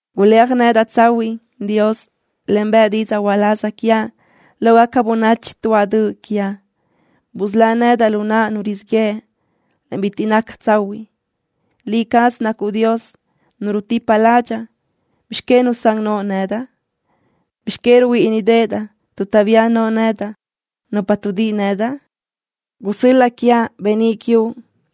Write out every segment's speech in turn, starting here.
Guléaj nedaʼ tsahuiʼ, Dios, en bëʼ didzaʼ uláz quiaʼ lógaca bönachi tuáʼ döʼ quiaʼ. Busölá nedaʼ lu naʼ nu rizíʼ yëʼ, en bitiʼ naca tsahuiʼ. Liʼ cazuʼ nacuʼ Dios, Nu rutipa ládxaʼa. ¿Bizx que nusán noʼo nedaʼ? ¿Bizx que ruhuíʼinidaʼ tuʼ taʼbía no nedaʼ nupa tuʼdíʼi nedaʼ? Gusö́l-laʼ quiaʼ beníʼ quiuʼ,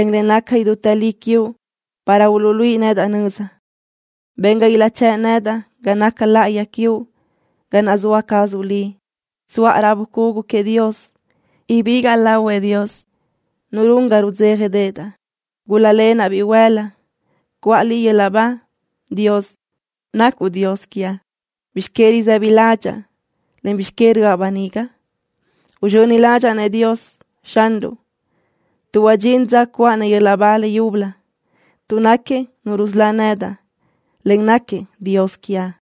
en le naca idútë li quiuʼ para uluʼluíʼi nedaʼ nöza. Ben ga ilaʼchë́ʼ nedaʼ ga naca láʼayi quiuʼ, ga naʼ zoa cazuʼ Liʼ. Tsuʼa raʼ bucugu queëʼ Dios. Ibígaʼa lahuëʼ Dios, Nu run ga rudzéjadeʼedaʼ. Gúl-lalenaʼ bihuël-la, cuʼa Liʼ yöl-laʼ ba, Dios, nacuʼ Dios quiaʼ. ¿Bizx que risë́bidaʼ ládxaʼa, en bizx que röʼa böniga? Uzxöni ládxaʼa-nëʼ Xanruʼ Dios, tuʼ huadxín dza cuʼa-nëʼ yöl-laʼ ba le yúbölö, tuʼ náquiëʼ Nu rusölá nedaʼ, en náquiëʼ Dios quiaʼ.